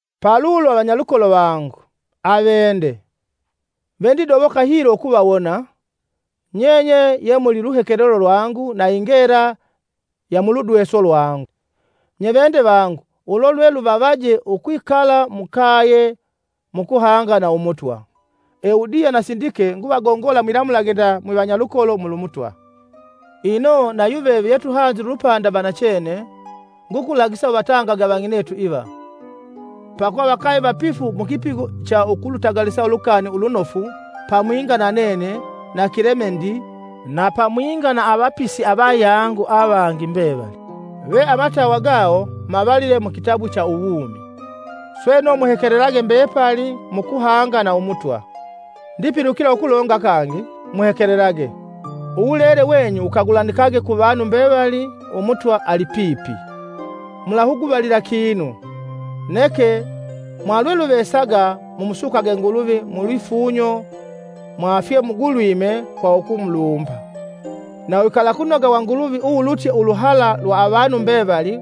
Palulo, vanyalukolo vangu, aveende, vendidoboka hilo ukuvawona; nyenye ye muli luhekelelo lwangu na ingela ya muludweso lwangu. Nye veende vangu ulo lwe luvavaje ukwikala mukaye mu kuhanga na Umutwa. Eudiya na Sindike nguvagongola mwilamulage nda mwivanyalukolo mulu Mutwa. Ino nayuveve munyalupanda vangu vanachene, ngukulagisa uvatangage avang'inetu iva, pakuva vakave vapifu mukipigo cha ukulutagalisa Ulukani Ulunofu pamwinga na nene na Kilemendi na pamwinga na avapisi avayangu avangi mbevali, ve amatawa gawo mavalile kuvalongwe ku uwumi. Sweno, muhekelelage mbepali mukuhanga na Umutwa! Ndipilukila ukulonga kangi; muhekelelage! Uwulele wenyu wukagulanikage ku vanu mbevali Umutwa alipipi. Mulahuguvalila kinu, Neke mwalwe luvesaga mumusukage Nguluvi mulwifunyo mwa fye mugulwime kwa ukumulumba. Na uwikalakunoga wa Nguluvi uwulutye uluhala lwa avanu mbevali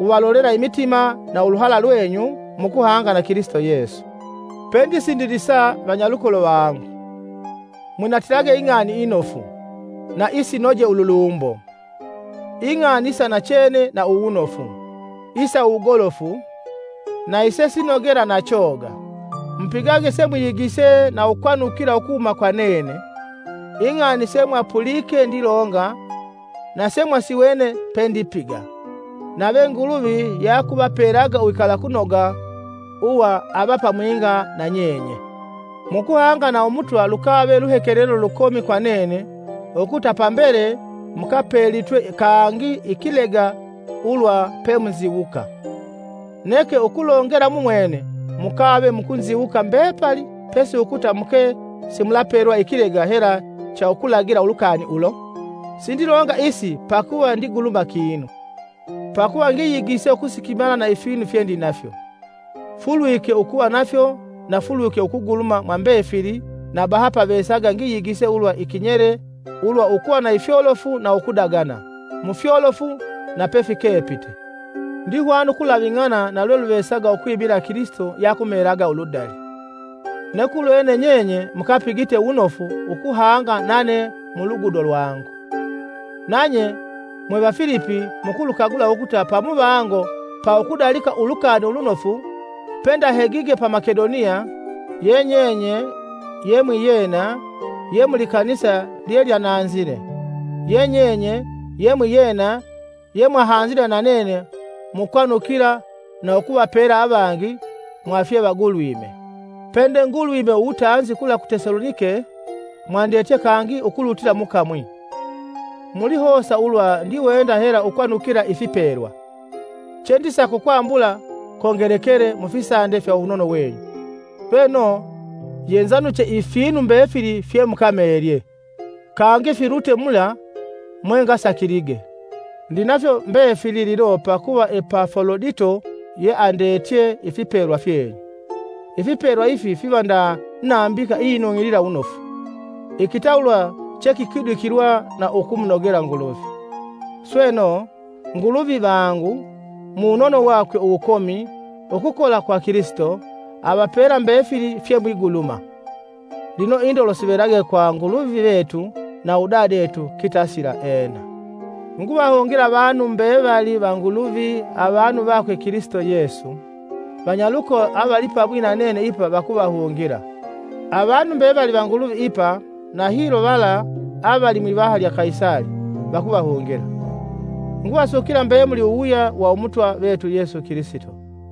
wuvalolela imitima na uluhala lwenyu mukuhanga na Kilisito Yesu. Pendisindilisa, vanyalukolo vangu, mwinatilage Ing'ani Inofu, na isinoje ululumbo, ing'ani isa nachene na uwunofu, isa uwugolofu, na isesinogela na choga. Mupigage semwiyigise na ukwanukila ukuhuma kwa nene, ing'ani semwapulike ndilonga na semwasiwene pendipiga. Nave Nguluvi yeakutupelaga uwikalakunoga uwa avamwinga na nyenye. Mukuhanga na Umutwa lukave luhekelelo lukomi kwa nene ukuta pambele mukapelitwe kangi ikilega ulwa pemunziwuka. Neke ukulongela mumwene mukave mukunziwuka mbepali pesi ukuta muke simulapelwa ikilega hela cha ukulagila ulukani ulo. Sindilonga isi pakuva ndiguluma kinu; pakuva ngakulwe ukusikimala na ifinu fyendinafyo, Fulwike ukuva nafyo na fulwike ukuguluma mwambefili na bahapavesaga ngiyigise ulwa ikinyele ulwa ukuva na ifyolofu na ukudagana, mufyolofu na pefikepite. Ndihwana ukulaving'ana kwa lweluvesaga pakuva Kilisito yeakumeelaga uludali. Neke ulwene nyenye mukapigite wunofu ukuhanga nane mulugudo lwangu. Nanye mwe Vafilipi mukulukagula ukuta pamuvango pa ukudalika Ulukani Ulunofu, pendahegige pa Makedoniya, ye nyenye ye mwiyena ye mulikanisa lyelyananzile; ye nyenye ye mwiyena yemwahanzile na nene mukwanukila na ukuvapela avangi mwa fyevagulwime. Pede-ngulwime uwutanzi kula ku Tesalonike mwandetye kangi ukulutila mu kamwi. Mulihosa ulwa ndiwenda hela ukwanukila ifipelwa; chendisaka ukwambula kongelekele mufisande fya uwunono wenyu. sweno, yenzanuche ifinu mbefili fyemukameelye, kangi filutye mula mwengasakilige. Ndinafyo mbefili lino pakuva Epafolodito yeandetye ifipelwa fyenyu. Ifipelwa ifi fiva nda nambika iyinung'ilila wunofu, ikitawulwa chekikwidikilwa na ukumunogela Nguluvi. Sweno, Nguluvi vangu, muwunono wakwe uwukomi ukukola kwa Kilisito, avapela mbefili fyemwiguluma. Lino indolo sivelage kwa Nguluvi vetu na udadetu, kitasila. Ena. Nguvahungila avanu mbevali va Nguluvi avanu vakwe Kilisito Yesu. Vanyalukolo avalipamwi na nene ipa vakuvahungila. Avanu mbevali va Nguluvi ipa, na hilo vala avali mwivaha lya Kaisali, vakuvahungila. Nguvasukila mbemuli uwuwuya wa Umutwa vetu Yesu Kilisito.